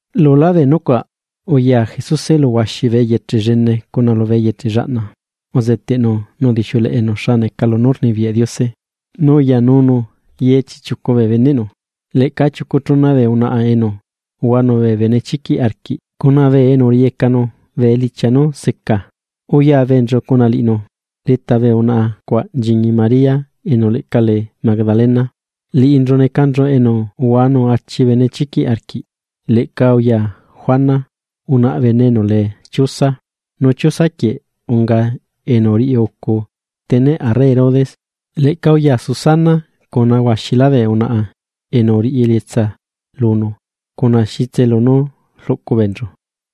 Lulá bee nucuaꞌ, uya Jesuse lu huaxi bee eyeche llene cuna lubee eyeche llaꞌna, uzeteꞌnu nu udixiuleꞌenu xa neca lunú rnibiyaꞌ Diose. Nu uyanunu ye chiꞌchiucu bee beneꞌnu. Leꞌca chiucu chuna bee unaꞌa enu uhuanu bee benechiquiꞌ arquiꞌ cuna bee enu uriꞌiyecanu bee elichia nú seca beenchu, uyabeenchu cuna liꞌinu. Leta bee unaꞌa cuaꞌ nchiñi María enu leꞌca lee Magdalena, liꞌinchu necanchu enu uhuanu achi benechiquiꞌ arquiꞌ. Leꞌca uya Juana, unaꞌa bene enu lee Chuza, nu Chuza quieꞌ unga enu uriꞌiucu steneꞌ arre Herodes, leꞌca uya Susana cuna huaxilá bee unaꞌa enu uriꞌi elietsa lunu cuna xitse lunú rluꞌcu beenchu.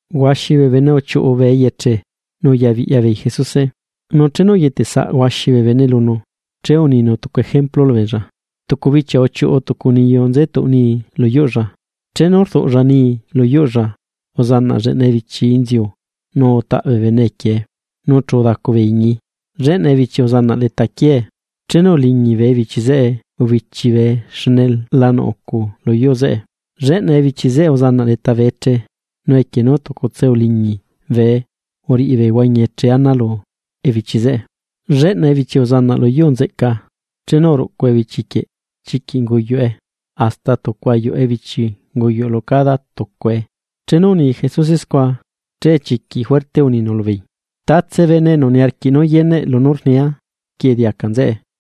Huaxi bee bene uchiuꞌu bee eyeche nu uyabiꞌya beei Jesuse. Nu chenu uyetesaꞌ huaxi bee bene lunu, che uninu tucu ejemplu lubeella: ―Tucu bichia uchiuꞌu tucu niyu nze tuꞌ nii lu yuꞌlla. Chenu rduꞌlla nii lu yuꞌlla, uzanaꞌ lleꞌna ebichi inziu nu utaꞌ bee bene equiee, nu chu udacu bee iñii. Lleꞌna ebichi uzanaꞌ leta quiee, chenu uliñi bee ebichi zeꞌe ubichi bee xne la nuꞌ ucu luyuu zeꞌe. Lleꞌna ebichi zeꞌe uzanaꞌ leta bee eche, nu equie nú tucutse uliñi bee uriꞌi bee huañi eche ana lu ebichi zeꞌe. Lleꞌna ebichi uzanaꞌ lu yuu nzeꞌca, chenu uruꞌcu ebichi quieꞌ, chiquiꞌ unguyuꞌe, hasta tucu ayuꞌu ebichi unguyuꞌ lu cada tucuae. Chenu uni Jesuse scua, che chiquiꞌ juerte uninu lubeei: ―¡Tatse bene enu niarquiꞌ nú yeneꞌ lunú rnia, quieꞌ diaca nzeꞌe!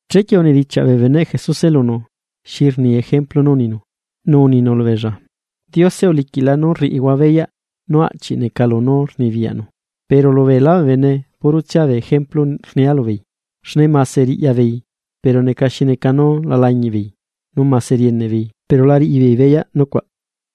Chequie unidichiaꞌ bee beneꞌ Jesuse lunu, xi rni ejemplu nú uninu. Nu uninu lubeella: ―Diose uliquiꞌla nú rriꞌihua beyaꞌ nú aꞌchi neca lunú rnibiyaꞌnu. Pero lu beela bee bene puro tsia bee ejemplu rnia lubeei, xne mase riꞌya beei, pero neca xi neca nú la lañiꞌ beei, nu mase rieneꞌ beei pero la riꞌi beei beyaꞌ nucuaꞌ.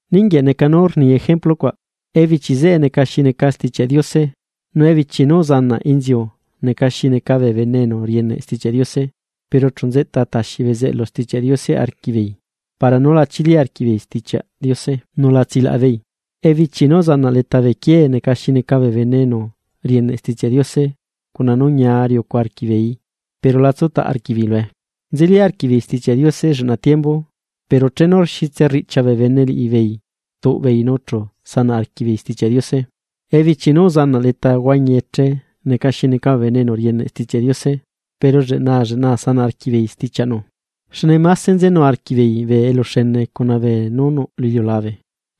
’Ninguieꞌ neca nú rni ejemplu cuaꞌ: Ebichi zeꞌe neca xi neca Stichiaꞌ Diose. Nu ebichi nú uzanaꞌ inziu neca xi neca bee bene enu rieneꞌ Stichiaꞌ Diose, pero chu nzeꞌta taxi bezeꞌlu Stichiaꞌ Diose arquiꞌbeei para nú la chili arquiꞌbeei Stichiaꞌ Diose, nu la tsilaꞌa beei. Ebichi nú uzanaꞌ leta bee quiee neca xi neca bee bene enu rieneꞌ Stichiaꞌ Diose cuna nú ñia riucu arquiꞌbeeii, pero la tsutaꞌ arquiꞌbeei lue. Nzelí arquiꞌbeei Stichiaꞌ Diose lleꞌna tiembu, pero chenu xitse rriꞌchia bee bene liꞌibeei rtuꞌ beei nu chu sanaꞌ arquiꞌ beei Stichiaꞌ Diose. Ebichi nú uzanaꞌ leta huañi eche neca xi neca bee bene enu rieneꞌ Stichiaꞌ Diose, pero lleꞌnaa lleꞌnaa sanaꞌ arquiꞌbeei stichiaꞌnu, xne máse nzenu arquiꞌbeei bee eluxene cuna beenú nuꞌ lu iliulabe,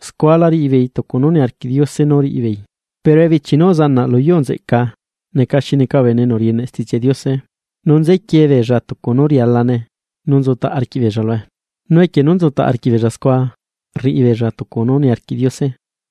scua la riꞌi beei tucu nú niarquiꞌ Diose nú riꞌi beei. Pero ebichi nú uzanaꞌ lu yuu nzeꞌca neca xi neca bee bene enu rieneꞌ Stichiaꞌ Diose, nu nzequiee beella tucu nú rialane nu nzutaꞌ arquiꞌbeella lue, nu equie nú nzutaꞌ arquiꞌ beella scua, rriꞌi beella tucu nú niarquiꞌ Diose.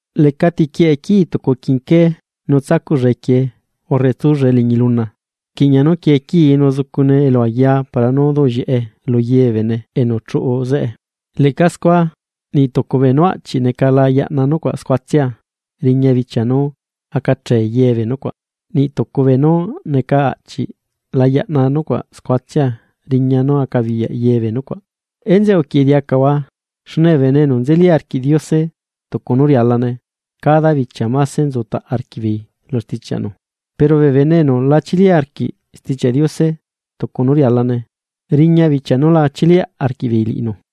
’Lecati quieꞌe quii tucu quinqué nu tsacuꞌlla equiee urre tsullae liñi luna, rquiꞌña nú quie quii nu zucune elu aya para nú duꞌllieꞌe lu ye bee bene enu chuꞌu zeꞌe. Leꞌca scua, niꞌ tucu beenú aꞌchi neca la yaꞌna nucuaꞌ scuatsia, riña nú acachee ye bee nucuaꞌ, nu niꞌ tucu beenú neca aꞌchiꞌ la yaꞌna nucuaꞌ scuatsia riña nú acabiyaꞌ ye bee nucuaꞌ. ’Enzeꞌe uquieꞌe diacahua, xne bee bene enu nzeli arquiꞌ Diose tucu nú rialane, cada bichia máse nzutaꞌ arquiꞌbeei lu stichiaꞌnu, pero bee bene enu la chili arquiꞌ Stichiaꞌ Diose tucu nú rialane, riña bichia nú la chiliaꞌ arquiꞌbeei liꞌinu.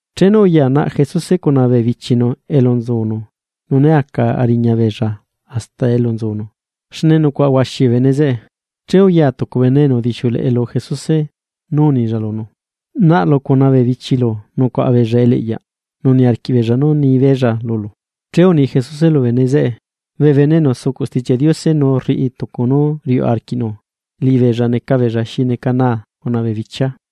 Chenu uya naꞌ Jesuse cuna bee bichinu elu nzunu, nu né aca ariña beella hasta elu nzunu, xne nucuaꞌa huaxi bee bene zeꞌe. Che uya tucu bene enu udixiuleꞌe lu Jesuse, nu unilla lunu: ―Naꞌlu cuna bee bichilu nucuaꞌa beella eliꞌyaꞌ, nú niarquiꞌ beella nú ni beella lulu. Che uni Jesuse lubee bene zeꞌe: ―Bee bene enu sucuꞌ Stichiaꞌ Diose nu rriꞌi tucu nú riuꞌ arquiꞌnu, liꞌibeella neca beella xi neca naa cuna bee bichia.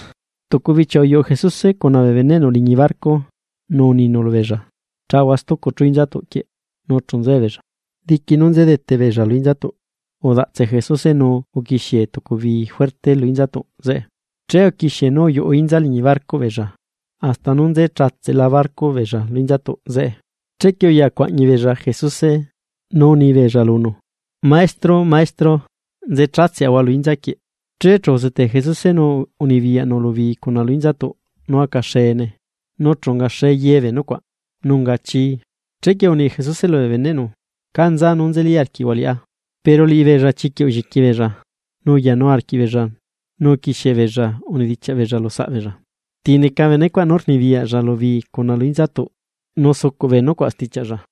Tucu bichia uyuꞌu Jesuse cuna bee beneꞌnu liñi barco, nu uninu lubeella: ―Chahua stucu chú inzatuꞌ quieꞌ. Nu chu nzuebeella. Diqui nú nze dete beella lu inzatuꞌ, udaꞌtse Jesuse, nu uquixie tucu bii juerte lu inzatuꞌ zeꞌe. Che uquixie nú uyuꞌu inza liñi barcoꞌ beella hasta nú nze chatseꞌla barcoꞌ beella lu inzatuꞌ zeꞌe. Chequie uya cuaꞌñi beella Jesuse, nu unibeella lunu: ―¡Maestro! ¡Maestro! ¡Nze chatseꞌahua lu inza quieꞌ! Che chu uzetee Jesuse, nu unibiyaꞌnu lu bii cuna lu inzatuꞌ nú aca xeene, nu chu ungaxe ye bee nucuaꞌ, nu unga chii. Chequie uni Jesuse lubee beneꞌnu: ―¿Cá nza nú nzeli arquiꞌhua liꞌá? Pero liꞌibeella chiquiꞌ ulliqui beella, nu uyanu arquiꞌbeella nu uquixie beella unidichiaꞌ beella lu saꞌbeella: ―¿Ti neca benecuaꞌ nú rnibiyaꞌlla lu bii cuna lu inzatuꞌ nu sucuꞌ bee nucuaꞌ stichiaꞌlla?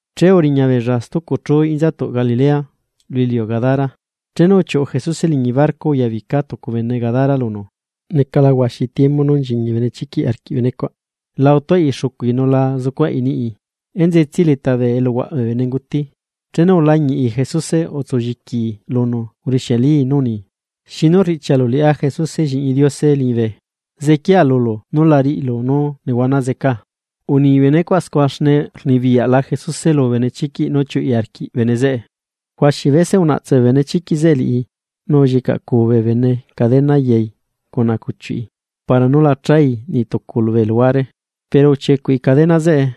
Che uriña beella stucu chú inzatuꞌ Galilea, lu iliu Gadara. Chenu uchiuꞌu Jesuse liñi barco uyabica tucu bene Gadara lunu. Necala huaxi tiembu nú nchiñi benechiquiꞌ arquiꞌ benecuaꞌ, la utuaꞌi xucui nu la zucuaꞌi niꞌi, enzetsiai leta bee eluhuaꞌ bee bene nguti. Chenu ulañiꞌi Jesuse, utsu lliquii lunu nu urixialii nú uni: ―¿Xinu riꞌchialu liꞌá Jesuse Lliꞌñi Diose liñibe? Zequiaa lulu nú la riꞌilu nú nehuana zecaa. Uni benecuaꞌ scua xne rnibiyaꞌla Jesuse lu benechiquiꞌ nú chiuꞌi arquiꞌ bene zeꞌe. Huaxi bese unaꞌtse benechiquiꞌ zeꞌe liꞌi, nu ullicaꞌcuu bee bene cadena yai cuna cuchiuꞌi para nú la chai niꞌ tucu bee luhuare, pero uchiecuꞌi cadena zeꞌe,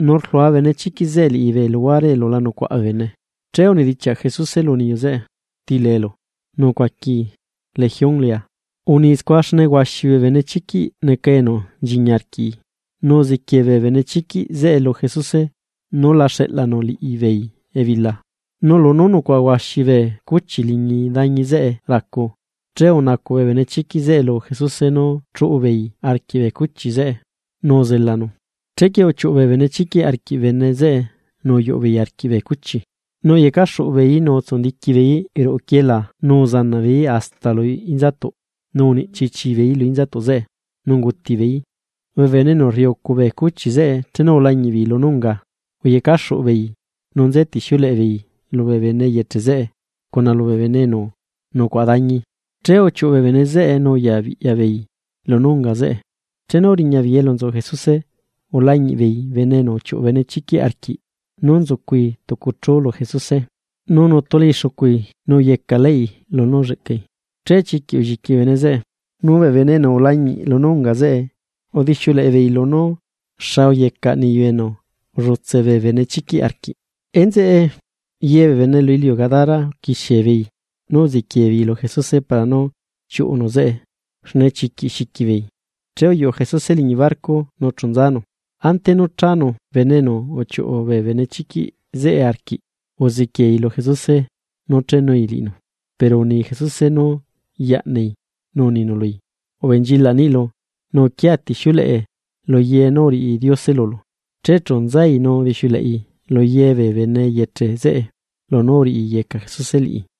nu rlua benechiquiꞌ zeꞌe liꞌi bee luhuare elu la nucuaꞌa bee bene. Che unidichiaꞌ Jesuse lu niyu zeꞌe: ―¿Ti leelu? Nu ucuaquii: ―Legión lea. Uni scua xne huaxi bee benechiquiꞌ neca enu nchiñi arquiꞌi. Nu uziquiee bee benechiquiꞌ zeꞌe lu Jesuse, nú la xeꞌlanu liꞌibeei ebila. Nu lunú nucuaꞌa huaxi bee cuchi liñi dañi zeꞌe racu, che unacuꞌ bee benechiquiꞌ zeꞌe lu Jesuse nú chuꞌu beeii arquiꞌ bee cuchi zeꞌe, nu uzelanu. Chequie uchiuꞌu bee benechiquiꞌ arquiꞌ bene zeꞌe nu uyuꞌu beei arquiꞌ bee cuchi, nu uyecaxuꞌu beeí nu utsundiqui beeí ruꞌu quieelaa nu uzanaꞌ beeí hasta lu inzatuꞌ nu uniꞌchi chii beeí lu inza zeꞌe, nu unguti beeí. Bee bene enu rriꞌiucu bee cuchi zeꞌe chenu ulañiꞌ beei lunú unga scua, uyecaxuꞌu beei nú nzetixiuleꞌe beei lubee bene eyeche zeꞌe cuna lubee bene enu nucuaꞌa dañi. Che uchiuꞌu bee bene zeꞌe nu uyabiꞌya beei lunú unga zeꞌe. Chenu uriña beei elu nzu Jesuse, ulañiꞌ beei bene enu uchiuꞌu bee benechiquiꞌ arquiꞌ nú nzucui tucu chú lu Jesuse, nu nutulai xucui nu uyecaꞌlaꞌi lunú ulleꞌcai, che chiquiꞌ ulliqui bee bene zeꞌe. Nu bee bene enu ulañiꞌ lunú unga zeꞌe, udixiuleꞌe beei lunú xa uyecaꞌ niyu enu ullutse bee benechiquiꞌ arquiꞌ. Enzeꞌe, ye bee bene lu iliu Gadara uquixie beei nú uziquie beei lu Jesuse para nú chiuꞌunu zeꞌe, xne chiquiꞌ xiqui beei. Che uyuꞌu Jesuse liñi barco nu chu nzanu. Ante nú chanu bene enu uchiuꞌu bee benechiquiꞌ zeꞌe arquiꞌ, uzequiei lu Jesuse nú chenui liꞌinu, pero uni Jesuse nú yaꞌnai, nu uninu lui: ―Ubenchilaꞌ niꞌilu, nu uquiatixiuleꞌe luye nú uriꞌi Diose lulu. Che chu nzai nu udixiuleꞌi lu ye bee bene eyeche zeꞌe lunú uriꞌiyeca Jesuse liꞌi.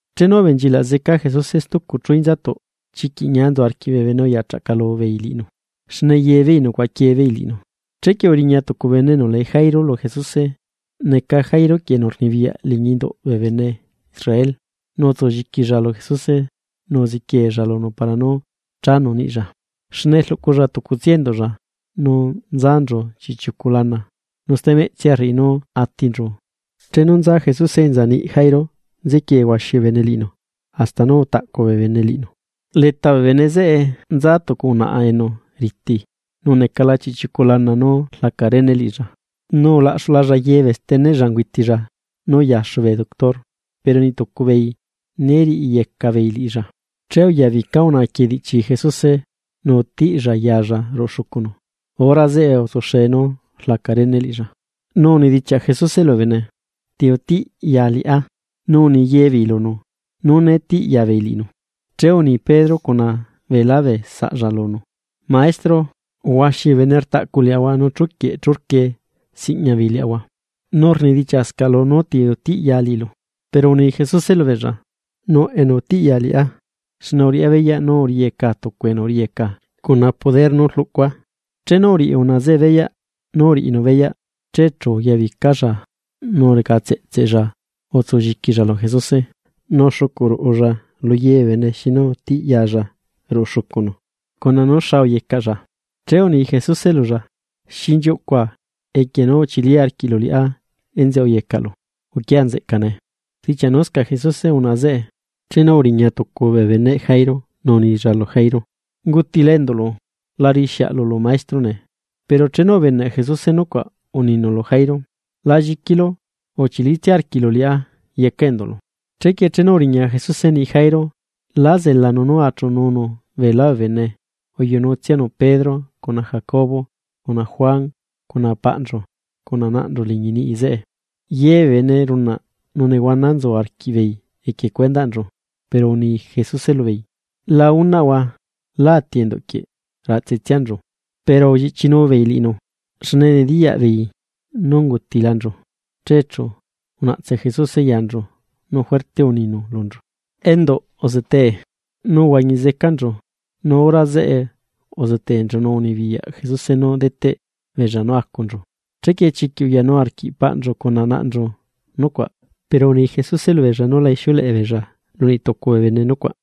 Chenu ubenchilaꞌ zeca Jesuse stucu chú inzatuꞌ, chiquiꞌ ñia nzu arquiꞌ bee bene uya chaꞌcalu beei liꞌinu, xne ye beei nucuaꞌa quie beei liꞌinu. Chequie uriña tucu bene enu lee Jairo lu Jesuse, neca Jairo quieꞌ enu rnibiyaꞌ liñi induꞌ bee bene Israel. Nu utsu lliquilla lu Jesuse nu uziquieella lunu para nú chanu niꞌlla, xne rluꞌculla tucutsia enduꞌlla, nu nzanchu chiꞌchiucu lana, nu stemeꞌtsia rriꞌi nú atinchu. Chenu nza Jesuse enza niꞌ Jairo nzequie huaxi bee bene liꞌinu, hasta nú utaꞌcu bee bene liꞌinu. Leta bee bene zeꞌe nza tucu unaꞌa enu riti, nu necala chiꞌchiucu lana nú rlaca rene liꞌilla, nu ulaꞌxulalla ye bee steneꞌlla ungüitilla nú uyaxu bee doctor, pero niꞌ tucu beei né riꞌiyeca beei liꞌilla. Che uyabica unaꞌa quieꞌ diꞌchi Jesuse nu utiꞌlla yalla ruꞌu xucunu, hora zeꞌe utsuxe nú rlaca rene liꞌilla. Nu unidichiaꞌ Jesuse lubee bene: ―¿Ti utiꞌya liꞌá? Nu uni yebeei lunu nú né tiꞌya beei liꞌinu, che uni Pedro cuna beelá bee saꞌlla lunu: ―Maestro, huaxi bee bene rtaꞌcu liaꞌahua nu chuquieꞌ churquie siꞌña beei liaꞌahua, nu rnidichiaꞌscaꞌlu: “¿Nú ti utiꞌya liꞌilu?” Pero uni Jesuse lubeella: ―Nuꞌ enu utiꞌya liꞌá, xne uriꞌá beyaꞌ nú uriꞌiyeca tucu enu uriꞌiyeca cuna nú recaa. Chenu uriꞌi unaꞌa zeꞌe beyaꞌ nú uriꞌinu beyaꞌ, che chu uyabicalla nu recatseꞌtsella utsulliquilla lu Jesuse. Nu uxucuꞌ dulalla luye bee bene xinu utiꞌyalla ruꞌu xucunu, cuna nú xa uyecaꞌlla. Che uni Jesuse lulla: ―Xinchiuꞌcua equie nú uchili arquiꞌlu liꞌá enzeꞌe uyecaꞌlu. Uquiaꞌa nzeꞌca nee. Rdichiaꞌnuscaꞌ Jesuse unaꞌa zeꞌe, chenu uriña tucu bee beneꞌ Jairo nu unilla lu Jairo: ―Ungutila enduꞌlu. La riꞌi xiaꞌlu lu Maestro nee. Pero chenu ubeneꞌ Jesuse nucuaꞌ uninu lu Jairo: ―La lliquilu, uchilitsia arquiꞌlu liꞌá yecaꞌ enduꞌlu. Chequie chenu uriña Jesuse niꞌi Jairo, lá zelanu nú achuꞌununu beelá bee bene, uyuꞌunutsianu Pedro, cuna Jacobo, cuna Juan cuna paꞌnchu cuna naꞌnchu liñi niꞌi zeꞌe. Ye bee bene runaꞌ, nu nehuana nzu arquiꞌbeei equie cuendaꞌnchu, pero uni Jesuse lubeei: ―La unaꞌhua. Lá ati enduꞌ quieꞌ, raꞌtsetsianchu. Pero ulliꞌchinu beei liꞌinu, xne nediyaꞌ beei nú ungutilanchu. Che chu unaꞌtse Jesuse yanchu, nu juerte uninu lunchu: ―¡Enduꞌ, uzetee! Nu uhuañi zecanchu, nu hora zeꞌe uzeteenchu nu unibiyaꞌ Jesuse nú deteꞌ beella nú acunchu. Chequie chiquiꞌ uyanu arquiꞌ paꞌnchu cuna naꞌnchu nucuaꞌ. Pero uni Jesuse lubeella nú la ixiuleꞌe beella lu niꞌ tucu bee bene lunú ungae scua.